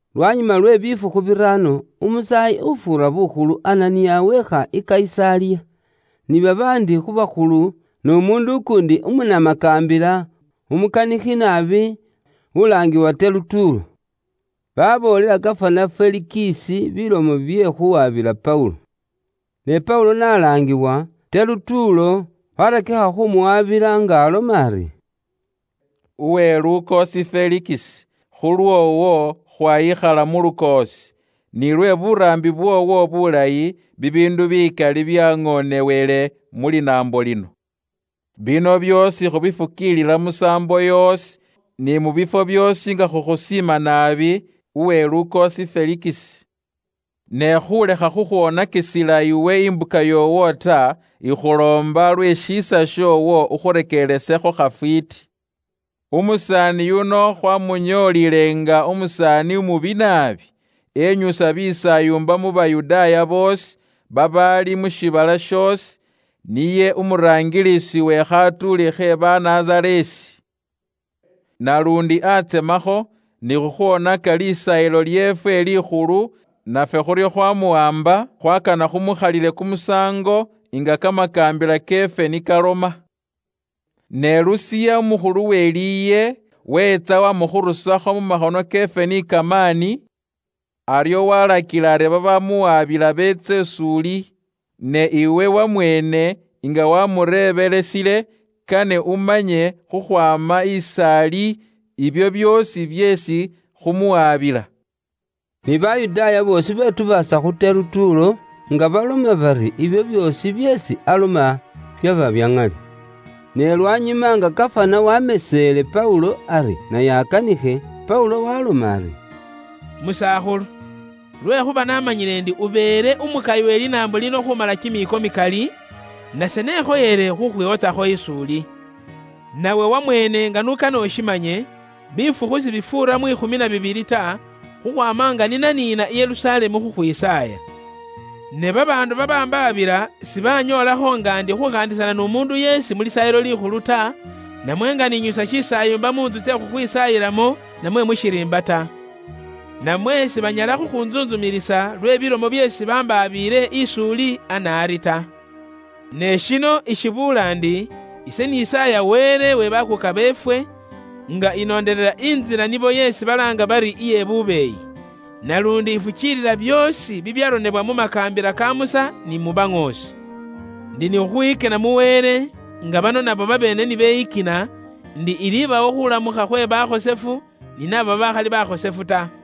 Lwanyuma lwe bifukhu biraano, umusaayi ufuura bukhulu Ananiya weekha i Kayisaliya, ni babaandi khu bakhulu n'umuundu ukuundi umunamakaambila umukanikhi naabi ulaangiwa Terutuulo. Baboolela gafana Felikisi bilomo bye khuwabila Paulo. Ne Paulo n'alaangibwa, Terutuulo waarakikha khuumuwaabila nga aloma ari: “Uwe lukoosi Felikisi, khulwoowo khwayikhala mu lukoosi, nilwe buraambi bwoowo bulayi, bibiindu bikali byaŋonewele mu linaambo lino. Bino byoosi khubifukiilila musaambo yoosi, ni mu bifwo byoosi nga khukhusiima naabi, uwe lukoosi Felikisi. Ne khulekha khukhwonakisila iwe imbuka yoowo ta, ikhuloomba lwe shiisa shoowo ukhureekelesekho khafwiiti. “Umusaani yuno khwamunyoolile nga umusaani umubi naabi, enyusa bisaayumba mu Bayudaaya boosi, babaali mu shiibala shoosi. Niye umuraangilisi we khatuuli khe Banazareesi. Naluundi akhakilekho khuukhola bye imbikho mu Lisaayilo lyeefwe Likhulu, nafwe khuryo khwamuwaamba, (khwakana khumukhalile kumusaango nga kamakaambila keefwe ni kaloma. Ne Lusiya umukhulu we liye, weetsa wamukhurusakho mu makhono keefwe ni kamaani, aryo walakila ari babamuwabila beetse is'uli). Ne iwe wamweene nga wamureebelesile, kane umanye khukhwaama is'ali ibyo byoosi byeesi khumuwabila.” Ni Bayudaaya boosi betubaasa khu Terutuulo nga baloma bari ibyo byoosi byeesi aloma byaba bya ŋali. Ne lwanyuma nga gafana wameseele Paulo ari naye akanikhe, Paulo waaloma ari: “Musakhulu, lwekhuuba naamanyile ndi ubeele umukayi we linaambo lino khuumala kimiiko mikali, nase nekhoyele khukhwiwotsakho is'uli. Nawe wamweene nga n'ukane ushimanye, bifukhu sibifuura mwikhumi na bibili ta, khukhwaama nga ni naniina i Yerusalemu khukhwisaaya. Ne babaandu babambaabila sibanyoolakho nga ndi khukhaandisana n'umuundu yeesi mu Lisaayilo Likhulu ta, namwe nga ninyusa shisaayumba mu ntsu tsye khukhwisaayilamo namwe mu shiriimba ta. Namwe sibanyala khukhuntsuntsumilisa lwe bilomo byeesi bambaabiile ise is'uli ana ari ta. Ne shino ishibuula ndi ise nisaaya Wele we bakuuka beefwe, nga inondelela Intsila nibo yeesi balaanga bari iye bubeeyi. Naluundi ifukiilila byoosi bibyaronebwa mu makaambila ka Musa ni mu baŋoosi. Ndi ni khukhwiyikina mu Wele nga bano nabo babeene ni beyikina; indi ilibawo khulamukha khwe bakhosefu ni naabo babaakhali bakhosefu ta.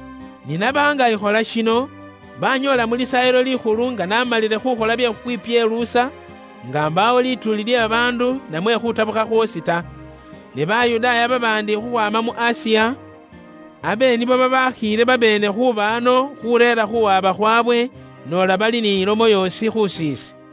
Ni naba nga ikhola shino, banyoola mu Lisaayilo Likhulu nga namalile khukhola bye khukhwipyeluusa, nga mbaawo lituuli lye babaandu namwe khutabukha khwoosi ta. Ne Bayudaaya babaandi khukhwaama mu Asiya, abe nibo babaakhiile babeene khuuba ano khureera khuwaba khwawe, noola bali ni lomo yoosi khusiise.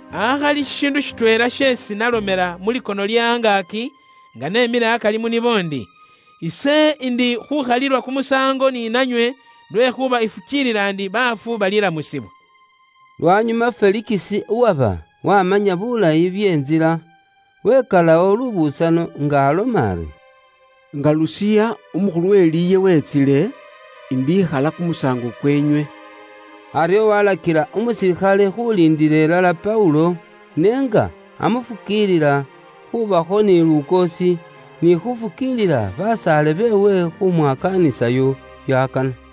Akhali shishiindu shitweela sheesi nalomela mu likono lye angaaki, nga nemile akari mu nibo ndi, ‘Ise ndi khukhalilwa kumusaango ni nanywe lwekhuuba ifukiilila ndi baafu balilamusibwa.’” Lwanyuma Felikisi uwaba wamanya bulayi bye Ntsila, wikalawo lubusano, nga aloma ari, “Nga Lusiya umukhulu we liye wetsile, kane ise ikhalewo bye kumusaango kwoowo.” Aryo walakila umusilikhale khuliindila ilala Paulo, ne nga amufukiilila khubakho ni lukoosi, ni khufukiilila basaale beewe khumwakaanisayo byakana.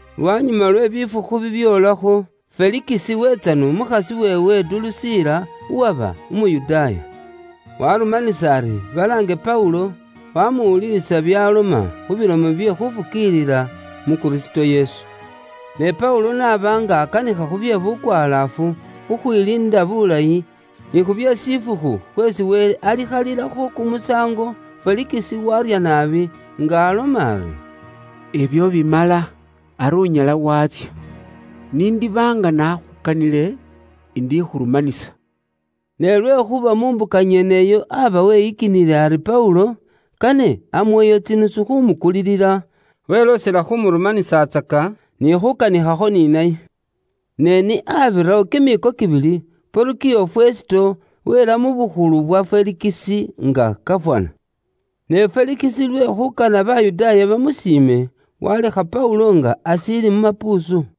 Lwanyuma lwe bifukhu bibyoolakho, Felikisi weetsa n'umukhasi weewe Durusiila, uwaba Umuyudaaya. Warumanisa ari balaange Paulo, wamuwuliilisa byaloma khu bilomo bye khufukiilila mu Kristo Yesu. Ne Paulo n'aba nga akanikha khubye bukwalaafu, khukhwiliinda bulayi, ni khubye shifukhu khweesi Wele alikhalilakho kumusaango, Felikisi warya naabi, nga aloma ari, “Ibyo bimala, ari unyala watsya. Nindiba nga nakhukanile, indikhurumanisa.” Ne lwekhuuba mu mbuka nyeneyo aba weyikinile ari Paulo kane amuweyo tsinusu khumukulilila, weloosela khumurumanisatsaka, ni khukanikhakho ni naye. Ne ni abirawo kimiiko kibili, Porukiyo Fesito weela mu bukhulu bwa Felikisi nga gafana. Ne Felikisi lwe khuukana Bayudaaya bamusiime, walekha Paulo nga ashiili mu mapuusu.